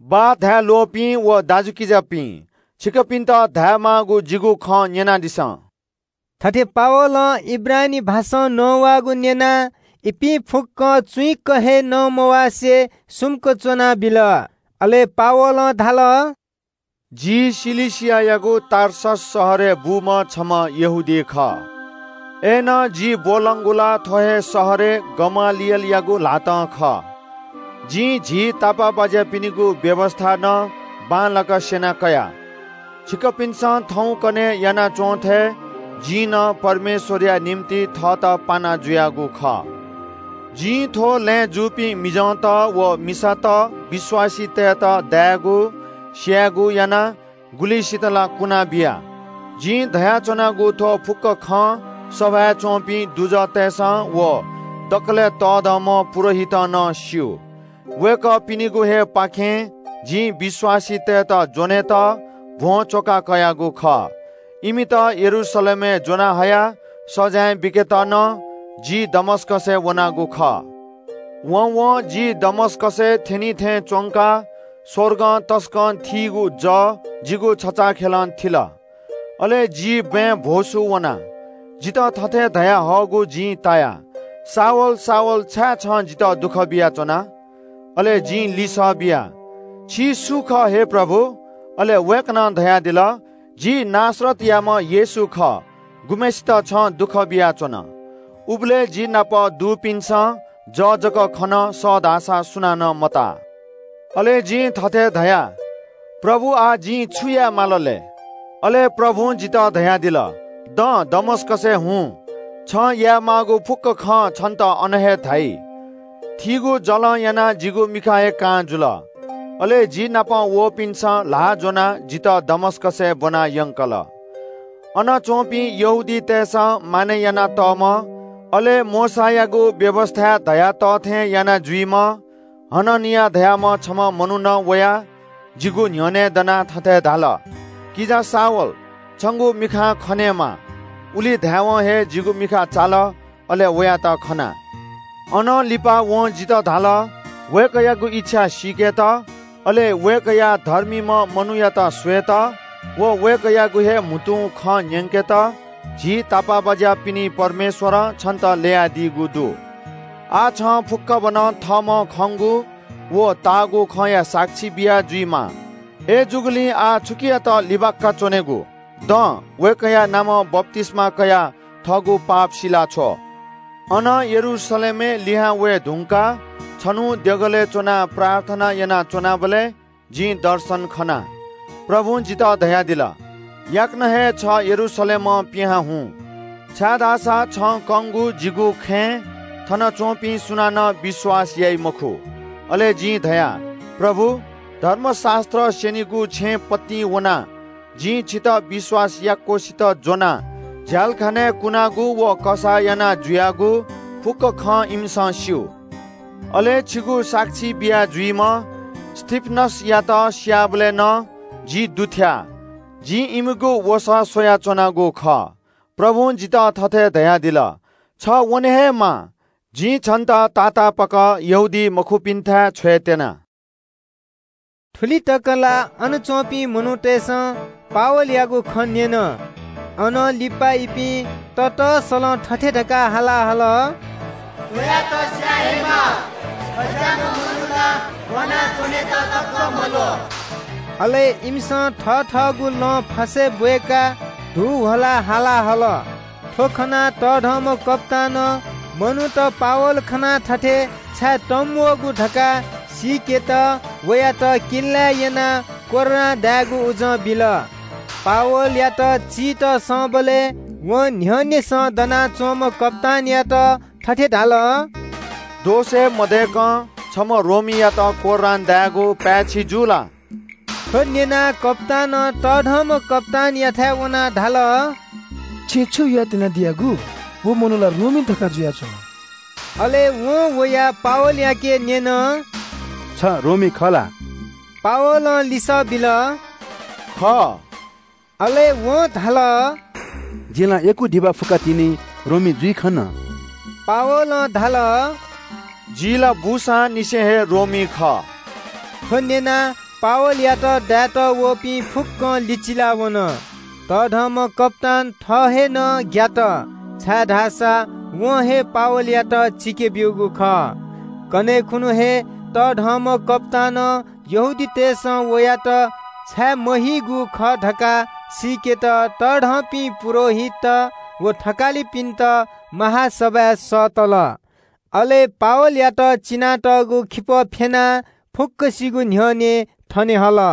“बाः धाये ल्‍वःपिं व दाजुकिजापिं, छिकपिन्‍त धायेमाःगु जिगु खँ न्‍यनादिसँ।” थथे पावलं हिब्रू भाषां नवाःगु न्‍यनाः इपिं फुक्‍कं चुइँक हे नमवासे सुम्‍क च्‍वना बिल। अले पावलं धाल – “जि किलिकियायागु टार्सस शहरय् बूम्‍ह छम्‍ह यहूदी खः। अय्‌नं जि ब्‍वलंगु ला थ्‍व हे शहरय् गमलिएलयागु ल्‍हातं खः। जिं झी तापाःबाज्‍यापिनिगु व्‍यवस्‍था नं बांलाक स्‍यना कया। छिकपिन्‍सं थौंकन्‍हय् याना च्‍वंथें जिं नं परमेश्‍वरया निंतिं थःत पाना जुयागु खः। जिं थ्‍व लँय् जूपिं मिजंत व मिसात विश्‍वासीतय्‌त दायेगु, स्‍यायेगु याना, गुलिसित ला कुना बिया। जिं धयाच्‍वनागु थ्‍व फुक्‍क खँ सभाय् च्‍वंपिं दुजःतय्‌सं व दकलय् तःधंम्‍ह पुजाहारीं नं स्‍यू। वय्‌कःपिनिगु हे पाखें जिं विश्‍वासीतय्‌त ज्‍वनेत भ्‍वं च्‍वका कयागु खः। इमित यरूशलेमय् ज्‍वनाहयाः सजाँय बीकेत नं जि दमस्‍कसय् वनागु खः।” “वँवं जि दमस्‍कसय् थ्‍यनी थें च्‍वंकाः स्‍वर्गं तसकं थीगु जः जिगु छचाःखेलं थिल। अले जि बँय् भ्‍वसू वना। जितः थथे धयाहःगु जिं ताया – ‘शाऊल, शाऊल, छाय् छं जितः दुःख बियाच्‍वना?’ “अले जिं लिसः बिया – ‘छि सु खः, हे प्रभु?’ “अले वय्‌कलं धयादिल – ‘जि नासरतयाम्‍ह येशू खः, गुम्‍हय्‌सित छं दुःख बियाच्‍वन।’ उबलय् जि नाप दुपिन्‍सं जः जक खन, सः धाःसा सुनानं मताः। “अले जिं थथे धया – ‘प्रभु, आः जिं छु याये माल लय्?’ “अले प्रभुं जितः धयादिल – ‘दँ, दमस्‍कसय् हुँ। छं यायेमाःगु फुक्‍क खँ छन्‍त अन हे धाइ।’ “थीगु जलं यानाः जिगु मिखा हे कां जुल। अले जि नाप वःपिन्‍सं ल्‍हाः ज्‍वनाः जितः दमस्‍कसय् ब्‍वनायंकल। “अन च्‍वंपिं यहूदीतय्‌सं मानय् यानातःम्‍ह अले मोशायागु व्‍यवस्‍थाय् धयातःथें यानाजुइम्‍ह हननिया धाःम्‍ह छम्‍ह मनुखं वयाः जिगु न्‍ह्यःने दनाः थथे धाल – ‘किजा शाऊल, छिगु मिखां खनेमा।’ उलि धायेवं हे जिगु मिखा चाल। अले वयात खना। “अनं लिपा वं जितः धाल – ‘परमेश्‍वरयागु इच्‍छा सीकेत, अले वय्‌कःया धर्मीम्‍ह मनूयात स्‍वयेत व वय्‌कःयागु हे म्‍हुतुं खँ न्‍यनेत झी तापाःबाज्‍यापिनि परमेश्‍वरं छितः ल्‍ययादीगु दु। आः छिं फुक्‍कभनं थःम्‍हं खंगु व ताःगु खँया साक्षी बियादीमाः। अय्‌जूगुलिं आः छुकियात लिबाका च्‍वनेगु? दनादिसँ, वय्‌कःया नामं बप्‍तिस्‍मा कयाः थःगु पाप सिला छ्वयादिसँ।’” “अनं यरूशलेमय् लिहां वये धुंकाः छन्‍हु देगलय् च्‍वनाः प्रार्थना यानाच्‍वनाबलय् जिं दर्शन खना। प्रभुं जितः धयादिल – ‘याकनं हे छ यरूशलेमं पिहां हुँ, छाय्‌धाःसा छं कंगु जिगु खँय् थनच्‍वंपिं सुनानं विश्‍वास याइ मखु।’ “अले जिं धया – ‘प्रभु, धर्मशास्‍त्र स्‍यनिगु छेँ पतिं वनाः जिं छितः विश्‍वास याक्‍वसित ज्‍वनाः झ्‍यालखानाय् कुनागु व कसाः याना जुयागु फुक्‍क खँ इमिसं स्‍यू। अले छिगु साक्षी बिया जुइम्‍ह स्‍तिफनसयात स्‍याःबलय् नं जि दुथ्‍याः, जिं इमिगु वसः स्‍वयाच्‍वनागु खः।’ “प्रभुं जितः थथे धयादिल – ‘छ वने हे माः, जिं छन्‍त तातापाक यहूदीमखुपिन्‍थाय् छ्वयेत्‍यना।’” थुलि तक ला अन च्‍वंपिं मनूतय्‌सं पावलयागु खँ न्‍यन। अनं लिपा इपिं ततःसलं थथे धकाः हाला हल – “थ्‍वयात स्‍याये हे माः। थज्‍याःम्‍ह मनू ला म्‍वानाच्‍वनेत तकं मल्‍वः।” अले इमिसं थथःगु लं फसय् ब्‍वय्‌काः धू ह्वलाः हाला हल। थ्‍व खनाः तःधंम्‍ह कप्‍तानं मनूत पावल खनाः थथे छाय् तंम्‍वःगु धकाः सीकेत वयात किल्‍लाय् यनाः कोर्रां दायेगु उजं बिल। पावलयात चित संबलय् वं न्‍ह्यःनेसं दनाच्‍वंम्‍ह कप्‍तानयात थथे धाल – “दोष हे मदय्‌कं छम्‍ह रोमीयात कोर्रां दायेगु पाय्‌छि जू ला?” थ्‍व न्‍यनाः कप्‍तानं तःधंम्‍ह कप्‍तानयाथाय् वनाः धाल – “छिं छु यायेत्‍यना दियागु? व मनू ला रोमी धकाः जुयाच्‍वन।” अले वं वयाः पावलयाके न्‍यन – “छ रोमी खः ला?” पावलं लिसः बिल – “खः।” अले वं धाल – “जि ला यक्‍व धिबा फुकाः तिनि रोमी जुइ खन।” पावलं धाल – “जि ला बूसांनिसें हे रोमी खः।” थ्‍व न्‍यनाः पावलयात दायेत वःपिं फुक्‍कं लिचिला वन। तःधंम्‍ह कप्‍तान थः हे नं ग्‍यात, छाय्‌धाःसा वं हे पावलयात चिके ब्‍यूगु खः। कन्‍हय् खुन्‍हु हे तःधंम्‍ह कप्‍तानं यहूदीतय्‌सं वयात छाय् द्वपं ब्‍यूगु खः धकाः सीकेत तःधंपिं पुजाहारीत व थकालिपिन्‍त महासभाय् सःतल। अले पावलयात फुक्‍कसिगु न्‍ह्यःने थने हल।